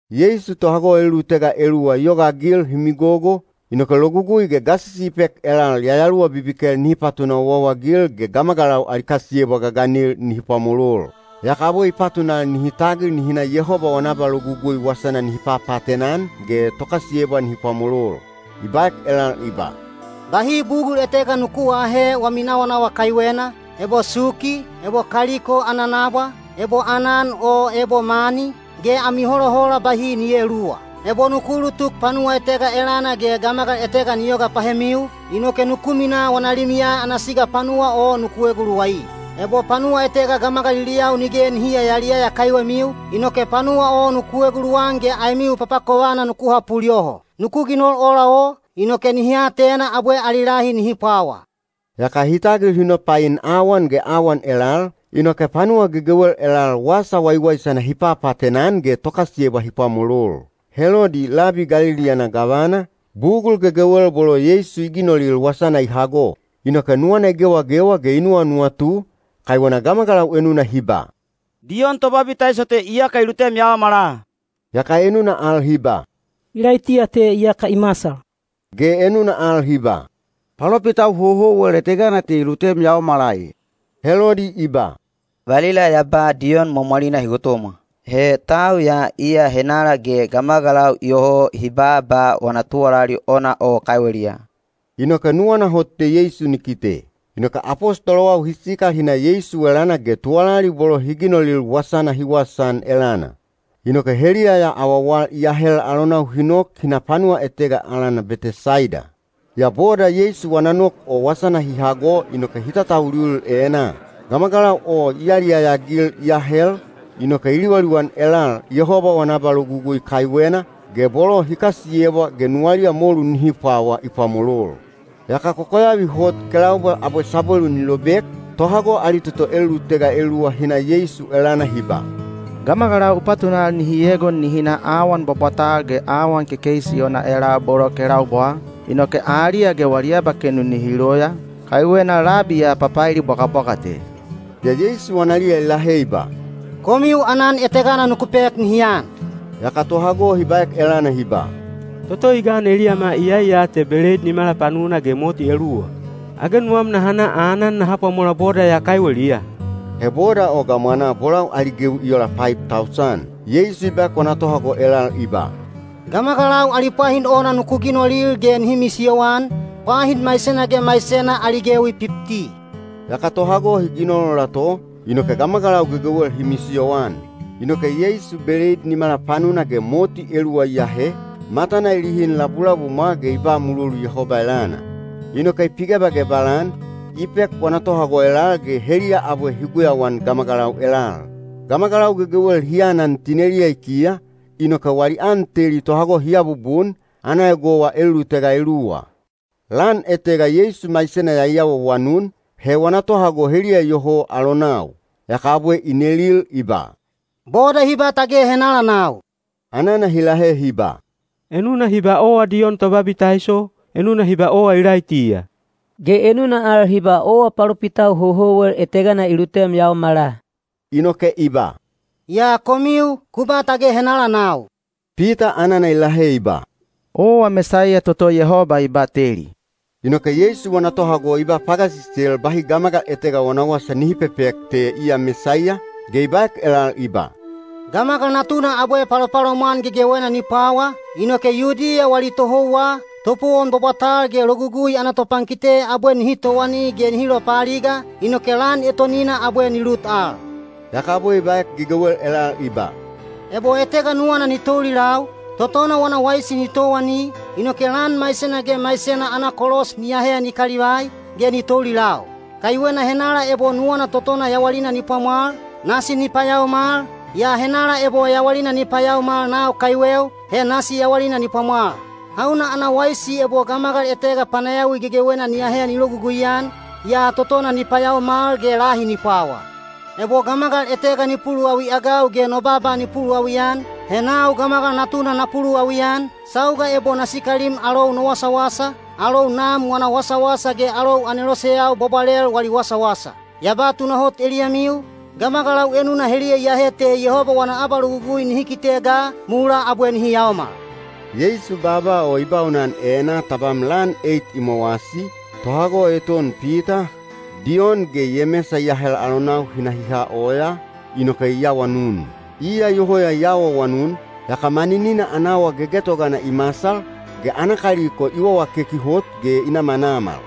Yeisu tohago elulutega eluwa i yogaagil hi migogo, inoke logugui ge gasisi i pek elal yayaluwa bibikel nihi patuna owaowa-agil ge gamagalau ali kasiyebwa gaganil nihi pwamolol. Yaka abwe i patunal nihi tagil nihi na Yehoba wana abalogugui wasana nihi papaatena-an ge tokasiyebwa nihi pwamolol. I baek elal i ba, “Bahi bugul etega nuku aahe wami nawanawa kaiwena, ebo suki, ebo kaliko ana nabwa, ebo aanan o ebo mani, ge ami holahola bahi ni eeluwa. Ebo nuku ulutuk panuwa etega elana ge gamagal etega ni yoga pahemiu, inoke nuku minaa wana limiya ana siga panuwa o nuku eguluwai. Ebo panuwa etega gamagaliliyau nige nihi yayaliyaya kaiwemiu, inoke panuwa o nuku eguluwan ge aemiu papakovana nuku hapul yoho. Nuku ginol ola o, inoke nihi atena abwe ali lahi nihi pwawa.” Yaka hi tagil hi nopain awan ge awan elal, inoke panuwa gegewel elal Wasa Waiwaisana hi papaatena-an ge tokasiyebwa hi pwamolol. Helodi, labi Galili ana gavana, bugul gegewel bolo Yeisu i ginolil wasana i hago. Inoke nuwana i gewagewa ge i nuwanuwatu, kaiwena gamagalau enuna hi ba, “Diyon Tobabitaiso te iyaka i lutem yaomala,” yaka enuna al hi ba, “Ilaitiya te iyaka i masal,” ge enuna al hi ba, “Palopitau houhouwel etegana te i lutem yaomala e.” Helodi i ba, “Valila ya ba Diyon mwamwalina hi gotomwa. He tau ya iya henala ge gamagalau iyoho hi baaba wana tuwalali ona o kaiweliya.” Inoke nuwana hot te Yeisu ni kite. Inoke apostolowau hi sikal hi na Yeisu elana ge tuwalali bolo hi ginolil wasana hi wasaan elana. Inoke heliya ya awawal i ahel alonau hi nok hi na panuwa etega alana Betesaida. Yaa boda Yeisu wana nok o wasana hi hago inoke hi tatauliulil enaa. Gamagalau o i yaliyaya-agil i ahel, inoke i liwaliwan elal Yehoba wana abalogugui kaiwena, ge bolo hi kasiyebwa ge nuwaliya molu nihi pwawa i pwamolol. Yaka kokoyavi hot kelaubwa abwe sabwelu ni lobek, tohago ali toto elulutega eluwa hi na Yeisu elana hi ba, “Gamagalau u patunal nihi egon nihi na awan bwabwatal ge awan kekeisi ona elal bolo kelaubwaa, inoke aliya ge wali abakenu nihi loya, kaiwena labi ya papaeli bwagabwaga te.” Yaa Yeisu analiya i lahe i ba, “Komiu aanan etegana nuku pek nihi an.” Yaka tohago hi baek elana hi ba, “Toto i gan eliyama iyai ya te beleid nimala panuna ge moti eluwa. Age nuwam naha na aanan naha pwamola boda ya kaiweliya?” (He boda o gamwanaa bolau ali gewi i ola paib tausan.) Yeisu i baek wana tohago elal i ba, “Gamagalau ali pwahin ona nuku ginolil ge nihi misiyoan, pwahin maisena ge maisena ali gewi pipti.” Yaka tohago hi ginol ola to, inoke gamagalau gegewel hi misiyoan. Inoke Yeisu beleid nimala panuna ge moti eluwa i ahe, matana i lihin labulabumwa ge i ba mulolu Yehoba elana. Inoke i pigebagebal-an, i pek wana tohago elal ge heliya abwe hi guyauan gamagalau elal. Gamagalau gegewel hi anan tineliya i kiya, inoke wali an teli tohago hi abubun, ana egowa elulutega eluwa. Lan etega Yeisu maisena ya i awaawanun, he wana tohago heliya iyoho alonau. Yaka abwe i nelil i ba, “Boda hi ba tage henala nau?” Anana hi lahe hi ba, “Enuna hi ba owa Diyon Tobabitaiso, enuna hi ba owa Ilaitiya, ge enuna al hi ba owa palopitau houhouwel etegana i lutem yaomala.” Inoke i ba, “Yaa komiu, ku ba tage henala nau?” Pita anana i lahe i ba, “Owa Mesaiya toto Yehoba i bateli.” Inoke Yeisu wana tohago i ba pagasisel bahi gamagal etega wana wasa nihi pepek te iya Mesaiya, ge i baek elal i ba, “Gamagal Natuna abwe palopalomwan gegewena ni pwawa, inoke Yudiya wali tohouwa, topowon bwabwatal ge Logugui ana topankite abwe nihi towani ge nihi lopaaliga, inoke lan etonina abwe ni lut al.” Yaka abwe i baek gegewel elal i ba, “Ebo etega nuwana ni toulilau, totona wana waisi ni towani, inoke lan maisena ge maisena ana kolos ni ahe ni kalivai, ge ni toulilau. Kaiwena henala ebo nuwana totona yawalina ni pwamwal, nasi ni payaomal, yaa henala ebo yawalina ni payaomal nau kaiweu, he nasi yawalina ni pwamwal. Hauna ana waisi ebo gamagal etega panayawi gegewena ni ahe ni logugui-an, yaa totona ni payaomal ge lahi ni pwawa? Ebo gamagal etega ni puluwawi-agau ge no baaba ni puluwawi-an, he nau Gamagal Natuna na puluwawi-an, sauga ebo na sikalim alou no wasawasa, alou Nam wana wasawasa ge alou aneloseyau bwabwalel wali wasawasa. Ya ba tunahot eliyamiu, gamagalau enuna heliya iyahe te Yehoba wana abalogugui nihi kite ga, mulaa abwe nihi yaomal.” Yeisu baaba o i baunan enaa tabam lan eit i mowasi, tohago eton Pita, Diyon ge Yemesa i ahel alonau hi na hi ha oyaa, inoke i awanun. Iya iyoho ya i awaawanun, yaka maninina ana awa gegetogana i masal, ge ana kaliko i wawakeki hot ge i namanamal.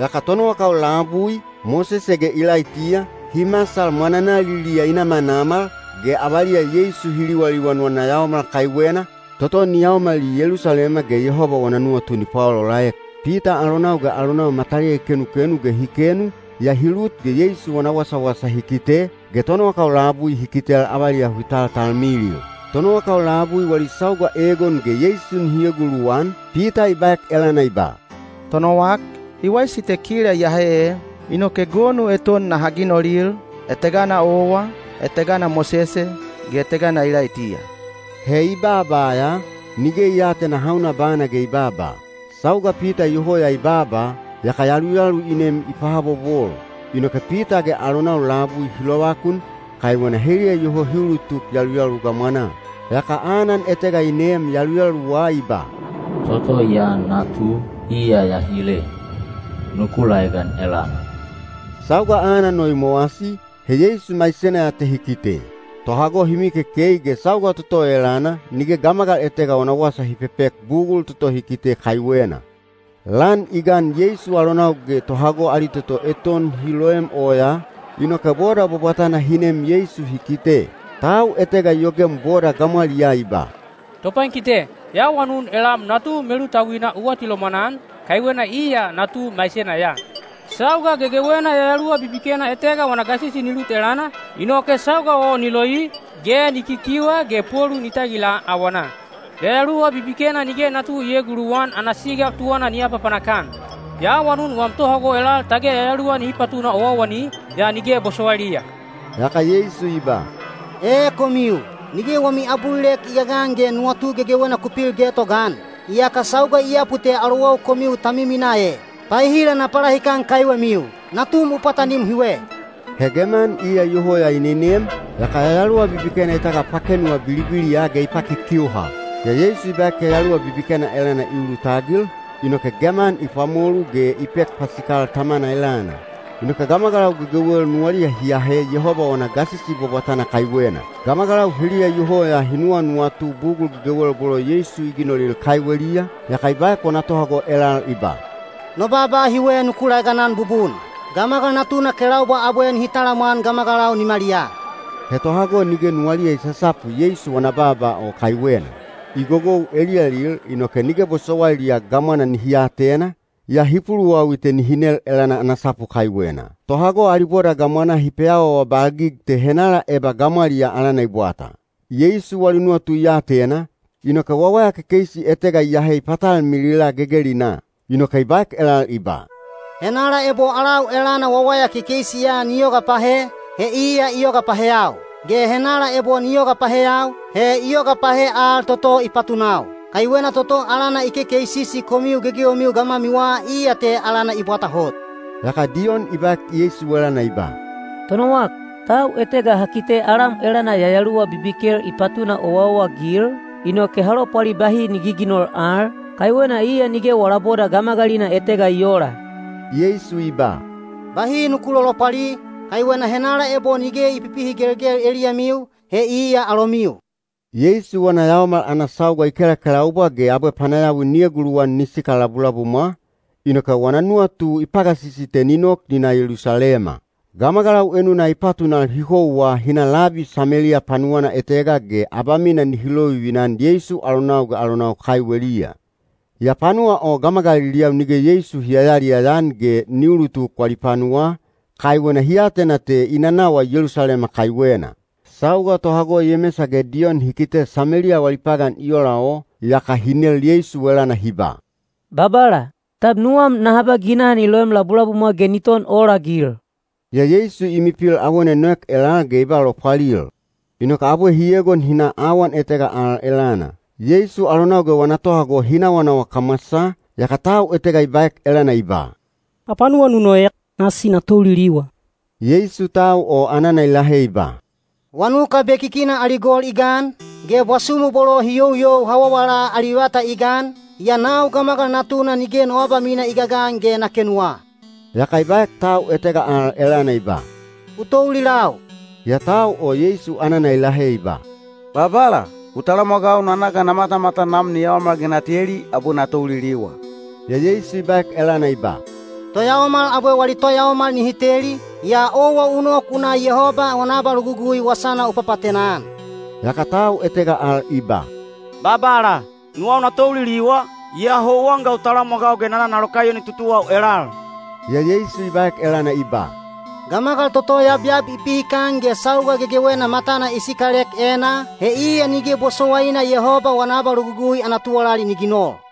Yaka tonowakau labui, Mosese ge Ilaitiya, hi masal mwananaliliya i namanamal, ge avaliya Yeisu hi liwaliwan wana yaomal kaiwena, toto ni yaomali Yelusalema ge Yehoba wana nuwatu ni paolaolaek. Pita alonau ge alonau mataliya i kenukenu ge hi kenu, yaa hi lut ge Yeisu wana wasawasa hi kite, ge tonowakau labui hi kitel avaliya hi taltalmilil. Tonowakau labui wali sauga egon ge Yeisu nihi eguluwan, Pita i baek elana i ba, “Tonowak, i waisi te kila iyahe ee. Inoke gonu eton naha ginolil, etegana owa, etegana Mosese, ge etegana Ilaitiya.” He i baaba ya, nige i aatena hauna bana ge i baaba. Sauga Pita iyoho ya i baaba, yaka yaluyalu i nem i pahabobol. Inoke Pita ge alonau labui hi lovakun, kaiwena heliya iyoho hi ulutuk yaluyalu gamwanaa. Yaka anan etega i neem yaluyaluwa i ba, “Toto ya natu, iya ya hile. Nuku laegan elana.” Sauga anan o i mowasi, he Yeisu maisena ya te hi kite. Tohago hi mikekei ge sauga toto o elana nige gamagal etega wana wasa hi pepek bugul toto hi kite kaiwena. Lan i gan Yeisu alonau ge tohago ali toto eton hi loem oyaa, inoke boda bwabwatana hi nem Yeisu hi kite. Tau etega i yogem boda gamwaliyaa i ba, “Topankite, ya awanun elam natu melutauina u atilomwan-an, kaiwena iya natu maisena ya. Sauga gegewena yayaluwa bibikena etega wana gasisi ni lut elana, inoke sauga o ni loi, ge ni kikiuha ge polu ni tagila awanaa. Yayaluwa bibikena nige natu ni eeguluwan ana siga tuwana ni apapanak-an. Ya awanun wam tohago elal tage yayaluwa nihi patuna owaowani, yaa nige bosowailiya.” Yaka Yeisu i ba, “Ee komiu, nige wami abulilek i gagan ge nuwatu gegewena ku pil getogaan! Iyaka sauga i yapu te alowau komiu ta miminaa e! Paehila na palahikan kaiwemiu? Natum u pwatanim hiwe.” He geman iya iyoho ya i nenem, yaka yayaluwa bibikena i tagapakenuwa bilibiliya ge i pakikiuha. Yaa Yeisu i baek yayaluwa bibikena elana i ulutagil, inoke geman i pwamolu ge i pek pasikal tamana elana. Inoke gamagalau gegewel nuwaliya hi ahe Yehoba wana gasisi bwabwatana kaiwena. Gamagalau heliya iyoho ya hi nuwanuwatu bugul gegewel bolo Yeisu i ginolil kaiweliya, yaka i baek wana tohago elal i ba, “No baaba hiwe nuku laeganan bubun: Gamagal Natuna kelaubwa abwe nihi talamwan gamagalau nimaliyaa.” He tohago nige nuwaliya i sasapu Yeisu wana baaba o kaiwena. I gogou eliyalil inoke nige bosowailiya gamwana nihi atena, yaa hi puluwawi te nihi nel elana ana sapu kaiwena. Tohago ali boda gamwanaa hi peawaawabalgig te henala eba gamwaliyaa alana i bwata. Yeisu wali nuwatu i atena, inoke wawaya kekeisi etega i ahe i patalmilila gegelinaa. Inoke i baek elal i ba, “Henala ebo alau elana wawaya kekeisi ya ni yoga pahe, he iya i yoga paheyau; ge henala ebo ni yoga paheyau, he i yoga pahe al toto i patunau. Kaiwena toto alana i kekeisisi komiu gegewemiu gamwamiwa iya te alana i bwata hot.” Yaka Diyon i baek Yeisu elana i ba, “Tonowak, tau etega ha kite alam elana yayaluwa bibikel i patuna owaowa-agil, inoke ha lopwali bahi ni giginol al, kaiwena iya nige wala boda gamagalina etega i oola.” Yeisu i ba, “Bahi nuku lolopwali, kaiwena henala ebo nige i pipihigelgel eliyamiu, he iya alomiu.” Yeisu wana yaomal ana sauga i kelakelaubwa ge abwe panayawi ni eguluwan ni sikal labulabumwa, inoke wana nuwatu i pagasisi te ni nok ni na Yelusalema. Gamagalau enuna i patunal hi houwa hi na labi Sameliya panuwana etega ge abamina nihi lovivina-an Yeisu alonau ge alonau kaiweliya. Yaa panuwa o gamagaliliyau nige Yeisu hi yayaliyaya-an ge ni ulutuk wali panuwaa, kaiwena hi atena te i nanawa Yelusalema kaiwena. Sauga tohago Yemesa ge Diyon hi kite Sameliya wali pagan i ola o, yaka hi nel Yeisu elana hi ba, “Babala, tab nuwam naha ba ginaha ni loem labulabumwa ge ni ton olagil?” Yaa Yeisu i milipil awona i noek elal ge i ba lopwalil, inoke abwe hi egon hi na awan etega al elana. Yeisu alonau ge wana tohago hi nawanawa kamwasaa, yaka tau etega i baek elana i ba, “Hapanuwa nu noek, nasi na touliliwa.” Yeisu tau o anana i lahe i ba, “Wanuka bekikina ali gol i gan, ge bwasumu bolo hi youyou hawawala ali vata i gan, yaa nau Gamagal Natuna nige no abamina i gagan ge na kenuwa.” Yaka i baek tau etega al elana i ba, “U toulilau.” Yaa tau o Yeisu anana i lahe i ba, “Babala, u talamwagau na na ga na matamatan nam ni yaomal ge na teli, abwe na touliliwa.” Yaa Yeisu i baek elana i ba, “Toyaomal abwe wali toyaomal nihi teli, yaa owa u nok u na Yehoba wana abalogugui wasana u papaatena-an.” Yaka tau etega al i ba, “Babala, nuwau na touliliwa, yaa houwan ga u talamwagau ge na na na lokaiyoni tutuwau elal.” Yaa Yeisu i baek elana i ba, “Gamagal toto yabyab i pihikan ge sauga gegewena matana i sikalek enaa, he iya nige bosowaina Yehoba wana abalogugui ana tuwalali ni ginol.”